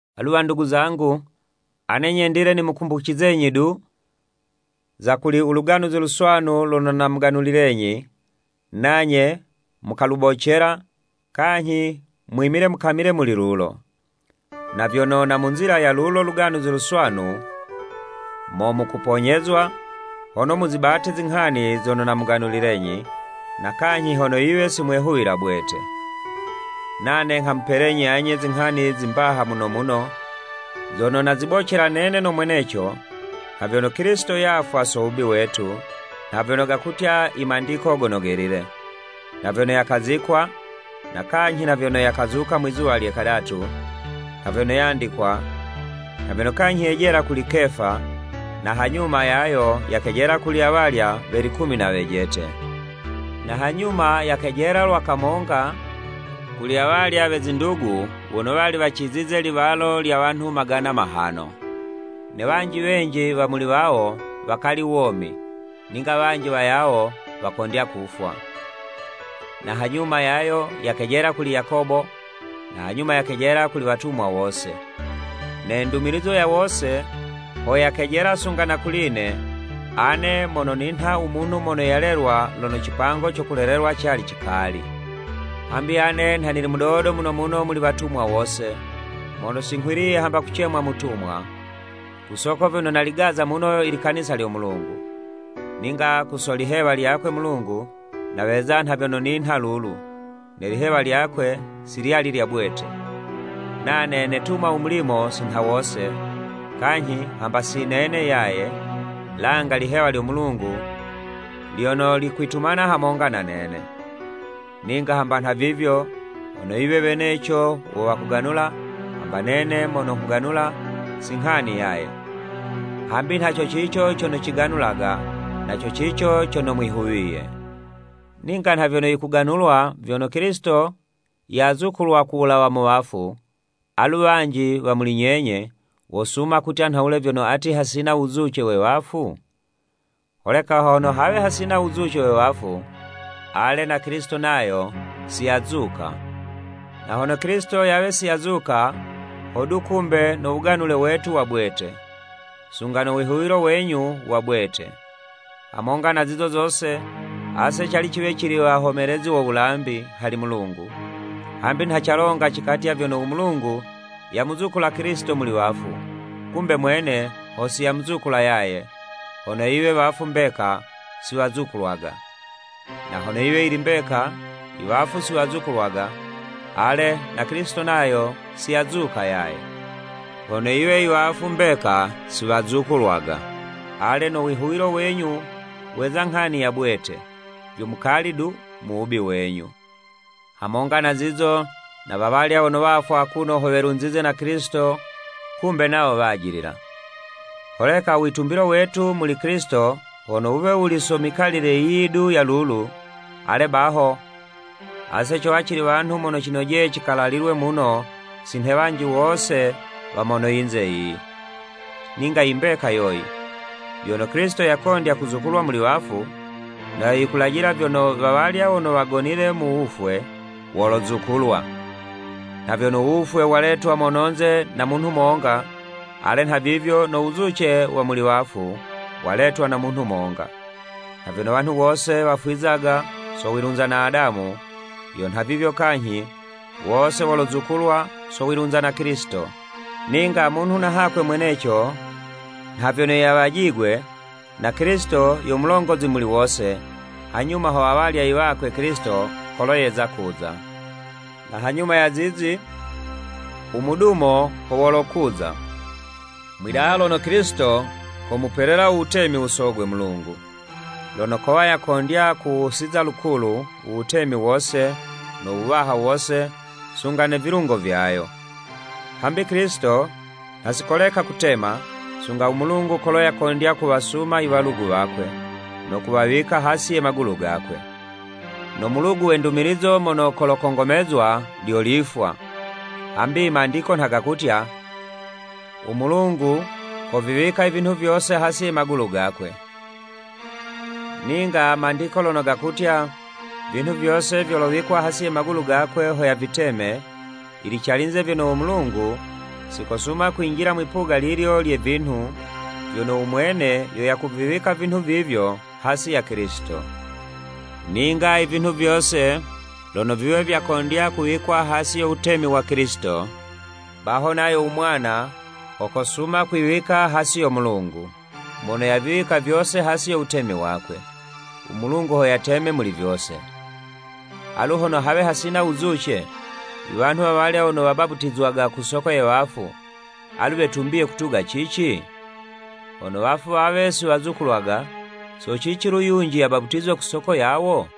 Alu wandugu zangu ane nyendile nimukumbucizenyi du, za kuli u Luganuzi Luswanu lono namuganulilenyi, nanye mukalubocela, kanyhi mwimile mukamile muli lulo. Na vyono na mu nzila ya lulo Luganuzi Luswanu, mo mukuponyezwa, hono muzibate zinghani zono namuganulilenyi, na kanyhi hono yiwe si mwehuwila bwete. Nane nghamupelenyi anye zinghani zi mbaha muno muno, zono nazibocela nene no mweneco, nha vyono, Kilisito yafwa so wubi wetu, nha vyono gakutya i Mandiko Gono Gelile, na vyono yakazikwa, na kanyhi na vyono yakazuka mwizuwa lye kadatu, nha vyono yandikwa, na vyono kanyhi yejela kuli Kefa, na hanyuma yayo yakejela kuli awalya we likumi na wejete. Na hanyuma yakejela lwa kamonga kuli awalya we zindugu wono wali wacizize liwalo lya wanhu magana mahano, ne wanji wenji wa muli wawo, wakali womi, ninga wanji wayawo wakondya kufwa. Na hanyuma yayo yakejela kuli Yakobo, na hanyuma yakejela kuli watumwa wose. Ne ndumilizo ya wose, ho yakejela sunga na kuli'ne, ane mono ninha u munhu mono yalelwa lono cipango co kulelelwa cali cikali. Hambi ane nha nili mudodo muno muno muli watumwa wose, mono singhwiliye hamba kucemwa mutumwa, ku soko vyono naligaza muno i likanisa lyo Mulungu. Ninga ku so lihewa lyakwe Mulungu, naweza nha vyono ninha lulu, ne lihewa lyakwe si lyali lya bwete. Nane netuma u mulimo si nha wose, kanyhi hamba si nene yaye, langa lihewa lyo Mulungu lyono likwitumana hamonga na nene. Ninga hamba nhavivyo, hono yiwe weneco wo wakuganula, hamba nene mono nghuganula, si nghani yaye, hambi nha co cico cono ciganulaga, na co cico cono mwihuwiye. Ninga nha vyono yikuganulwa, vyono Kilisito yazukulwa ku wulawa mu wafu, alu wanji wa muli nyenye, wosuma kutya nhawule vyono ati hasina wuzuce we wafu? Holeka hono hawe hasina u wuzuce we wafu, ale, na Kilisito nayo si yazuka, na hono Kilisito yawe si yazuka, hodu kumbe no wuganule wetu wa bwete, sunga no wihuwilo wenyu wa bwete. Hamonga na zizo zose, ase cali ciwe cili wahomelezi wo wulambi hali Mulungu, hambi nha calonga cikatya vyono u Mulungu yamuzukula Kilisito muli wafu, kumbe mwene ho si yamuzukula yaye, hono yiwe i wafu mbeka si wazukulwaga. Na hono yiwe yili mbeka i wafu si wazukulwaga, ale, na Kilisito nayo si yazuka yaye. Na hono yiwe Kilisito si yazukulwa, ale, no wihuwilo wenyu weza nghani ya bwete, vyo mukali du mu wubi wenyu. Hamonga na zizo na wawalya wono wafwa akuno ho vilunzize na Kilisito kumbe nawo wajilila. Holeka u witumbilo wetu muli Kilisito, hono wuwe wuli so mikalile yiyi du ya lulu, ale baho, ase cowa cili wanhu mono cinojeye cikalalilwe muno si nhe wanji wose wa mono yinze yiyi. Ninga i mbeka yoyi, vyono Kilisito yakondya kuzukulwa muli wafu, na yo yikulajila vyono, wawalya wono wagonile mu wufwe, wolozukulwa. Nha vyono u wufwe waletwa mononze na munhu monga, ale, nhavivyo no wuzuce wa muli wafu, waletwa na munhu monga. Nha vyono wanhu wose wafwizaga so wilunza na Adamu, yo nhavivyo kanyhi, wose wolozukulwa so wilunza na Kilisito. Ninga munhu na hakwe mweneco nha vyono yawajigwe, na Kilisito, yo mulongozi muli wose, hanyuma ho awalya i wakwe Kilisito kolo yeza kuza. Na hanyuma ya zizi, u mudumo ho wolokuza, mwidaha lono Kilisito komupelela u wutemi u Sogwe Mulungu, lono kowa yakondya kuwusiza lukulu, u wutemi wose, no wuwaha wose, sunga ne vilungo vyayo. Hambi Kilisito nha si koleka kutema, sunga u Mulungu kolo yakondya kuwasuma i walugu wakwe, no kuwawika hasi ye magulu gakwe. No mulugu we ndumilizo mono kolokongomezwa, lyo lifwa. Hambi imandiko nha gakutya, “U Mulungu koviwika i vinhu vyose hasi ye magulu gakwe.” Ninga, Mandiko lono gakutya, “Vinhu vyose vyolowikwa hasi ye magulu gakwe ho yaviteme, yili calinze vyono u Mulungu si kosuma kwinjila mwipuga lilyo lye vinhu, vyono u mwene yo yakuviwika vinhu vivyo hasi ya Kilisito.” Ninga i vinhu vyose, lono viwe vyakondya kuwikwa hasi yo wutemi wa Kilisito, baho nayo u Mwana, ho kosuma kwiwika hasi yo Mulungu, mono yaviwika vyose hasi yo wutemi wakwe, u Mulungu ho yateme muli vyose. Alu hono hawe hasina wuzuce, i wanhu wawalya wono wabaputizwaga ku soko ye wafu, alu wetumbiye kutuga cici? Hono wafu wawe si wazukulwaga, so cici lu yunji yabaputizwe ku soko yawo.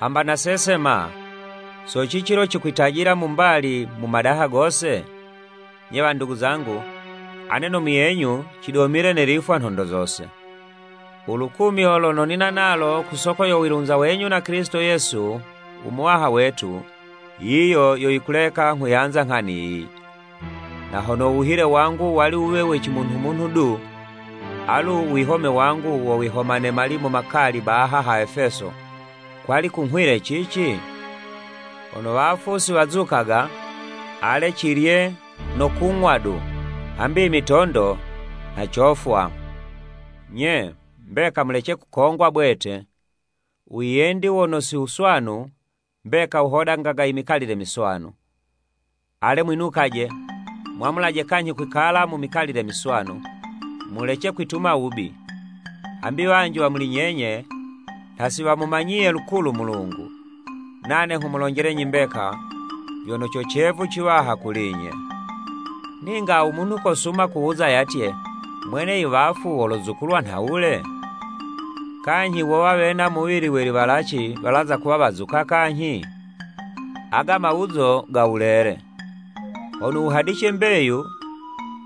Hamba nase ma, so cici lo cikwitajila mu mbali mu madaha gose? Nye wandugu zangu, ane no muyenyu cidomile ne lifwa nhondo zose! U lukumyo lono nina nalo ku soko yo wilunza wenyu na Kilisito Yesu u Muwaha wetu, yiyo yo yikuleka nghuyanza nghani yiyi. Na hono u wuhile wangu wali wuwe we cimunhu-munhu du, alu u wihome wangu wo kwihoma ne malimu makali baha ha Efeso, kwali kunghwile cici? Hono wafu siwazukaga, ale, “Cilye no kung'wa du, hambi i mitondo nha cofwa.” Nye, mbeka mulece kukongwa bwete! U wiyendi wono si wuswanu, mbeka wuhodangaga i mikalile miswanu. Ale, mwinukaje! Mwamulaje kanyhi kwikala mu mikalile miswanu, mulece kwituma wubi. Hambi wanji wa muli nyenye nha si wamumanyiye lukulu u Mulungu. Nane nghumulonjelenyi mbeka, vyono co cevu ciwaha kuli'nye! Ninga u munhu kosuma kuwuza yatye, “Mwene i wafu wolozukulwa nhawule? Kanyhi wowa wena muwili we liwalaci walazakuwa wazuka kanyhi?” Ago mawuzo ga wulele! Hono wuhadice mbeyu,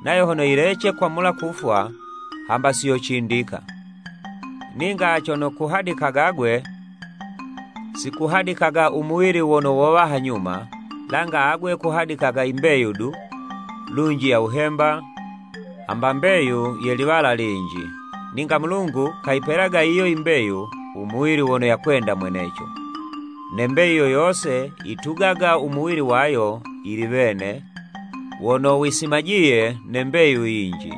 nayo hono yilece kwamula kufwa, hamba si yocindika. Ninga cono kuhadikaga 'gwe, si kuhadikaga u muwili wono wowa hanyuma, langa agwe kuhadikaga i mbeyu du, lunji ya wuhemba, hamba mbeyu ye liwala linji. Ninga Mulungu kayipelaga yiyo yi mbeyu, u muwili wono yakwenda mweneco, ne mbeyu yo yose, yitugaga u muwili wayo yili wene wono wisimajiye ne mbeyu yinji.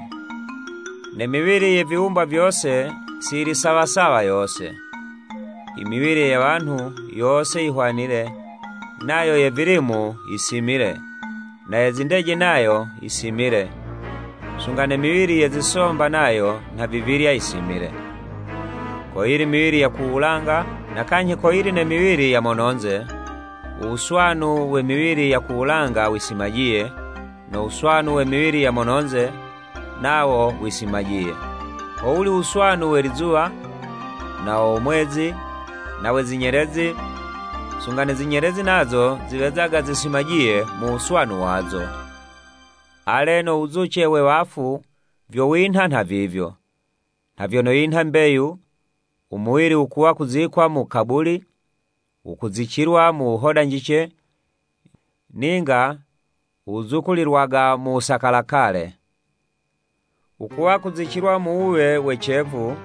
Ne miwili ye viwumbwa vyose si yili sawa sawa yose. I miwili ye wanhu, yose yihwanile, nayo ye vilimu yisimile, na ye zindeje nayo yisimile, sunga ne miwili ye zisomba nayo nhavivilya yisimile. Koyili i miwili ya ku wulanga, na kanyhi koyili ne miwili ya mono'nze, u wuswanu we miwili ya ku wulanga wisimajiye, no wuswanu we miwili ya mono'nze, nawo wisimajiye. Howuli u wuswanu we lizuwa, na wo mwezi, na we zinyelezi, sunga ne zinyelezi nazo ziwezaga zisimajiye mu wuswanu wazo. Ale no wuzuce we wafu vyo winha nhavivyo. Nha vyono yinha mbeyu, u muwili wukuwa kuzikwa mu kabuli, wukuzicilwa mu wuhodanjice, ninga wuzukulilwaga mu wusakalakale. Wukuwa kuzicilwa mu wuwe we cevu,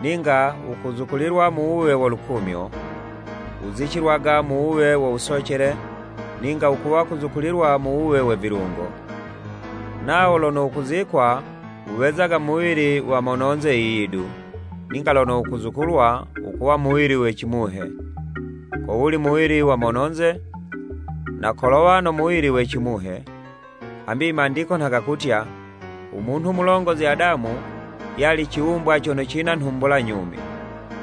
ninga wukuzukulilwa mu wuwe wo lukumyo, wuzicilwaga mu wuwe wo wusocele, ninga wukuwa kuzukulilwa mu wuwe we vilungo. Nawo lono wukuzikwa, wuwezaga muwili wa mono'nze yiyi du, ninga lono wukuzukulwa wukuwa muwili we cimuhe. Kowuli muwili wa mono'nze, na kolowa no muwili we cimuhe. Hambi i Mandiko nha gakutya, “Umunhu mulongozi Adamu yali ciwumbwa cono cina nhumbula nyumi.”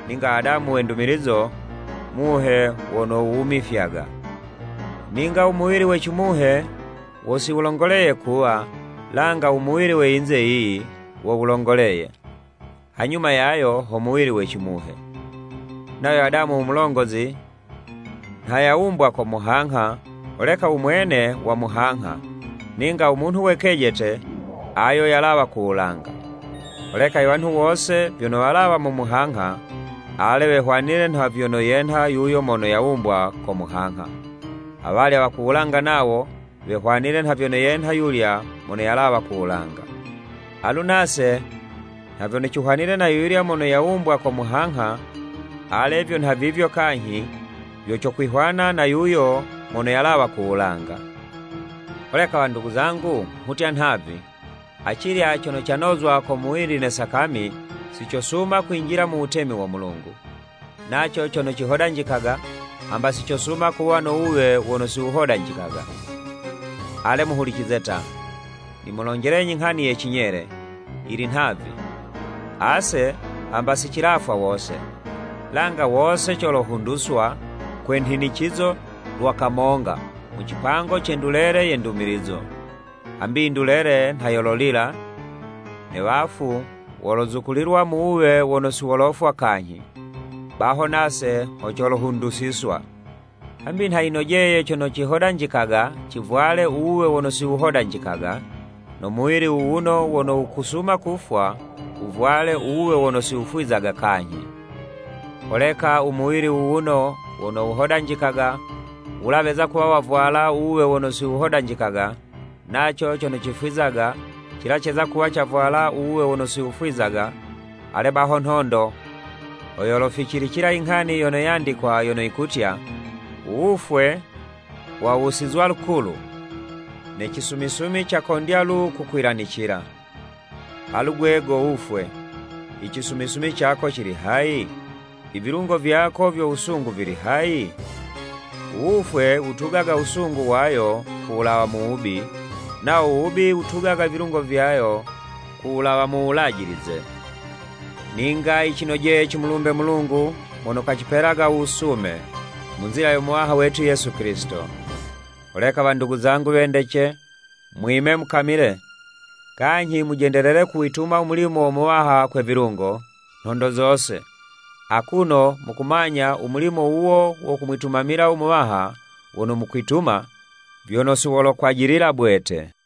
Ninga Adamu we ndumilizo, Muhe wono wuwumifyaga. Ninga u muwili we cimuhe wo si wulongoleye kuwa, langa u muwili we yinze yiyi, wo wulongoleye, hanyuma yayo, ho muwili we cimuhe. Nayo Adamu u mulongozi, nha yawumbwa ko muhangha, holeka u mwene wa muhangha, ninga u munhu we kejete, ayo yalawa ku wulanga. Holeka i wanhu wose vyono walawa mu muhangha, ale, wehwanile nha vyono yenha yuyo mono yawumbwa ko muhangha, awalya wa ku wulanga nawo, wehwanile nha vyono yenha yulya mono yalawa ku wulanga. Alu nase, nha vyono cihwanile na ayulya mono yawumbwa ko muhangha, ale vyo nhavivyo kanyhi, vyo cokwihwana na yuyo mono yalawa ku wulanga. Holeka wandugu zangu, nghutya nhavi, acilya cono canozwa ko muwili ne sakami, si cosuma kwinjila mu wutemi wo Mulungu, naco cono cihodanjikaga, hamba si cosuma kuwa no wuwe wono si wuhodanjikaga. Ale, muhulicize ta, nimulonjelenyi nghani ye cinyele, yili nhavi, ase hamba si cilafwa wose, langa wose colohunduswa, kwa nhinicizo, lwa kamonga, mu cipango ce ndulele ye ndumilizo. Hambi yindulele nha yololila, ne wafu wolozukulilwa mu wuwe wono si wolofwa kanyhi, baho nase ho colohundusiswa. Hambi nha yinojeye cono cihodanjikaga, civwale u wuwe wono si wuhodanjikaga, no muwili wuwuno wono wukusuma kufwa, wuvwale u wuwe wono si wufwizaga kanyhi. Holeka u muwili wuwuno wono wuhodanjikaga, wula weza kuwa wavwala u wuwe wono si wuhodanjikaga, naco cono cifwizaga, cila ceza kuwa cavwala u wuwe wono si wufwizaga, ale baho nhondo, ho yoloficilila i nghani yono yandikwa, yono yikutya, “U wufwe wawusizwa lukulu, ne cisumisumi cakondya lu kukwilanicila!” “Alu gwe go wufwe, i cisumisumi cako cili hayi? I vilungo vyako vyo wusungu, vili hayi?” U wufwe wutugaga wusungu wayo ku wulawa mu wubi, nawo u wubi wutugaga i vilungo vyayo ku wulawa mu wulajilize. Ninga yicinojeye cimulumbe Mulungu mono kacipelaga u wusume, mu nzila yo Muwaha wetu Yesu Kilisito. Holeka wandugu zangu wendece, mwime mukamile. Kanyhi mujendelele kuwituma u mulimo wo Muwaha kwe vilungo, nhondo zose, akuno mukumanya, u mulimo wuwo wo kumwitumamila u Muwaha wono mukwituma, vyono si wolokwajilila bwete.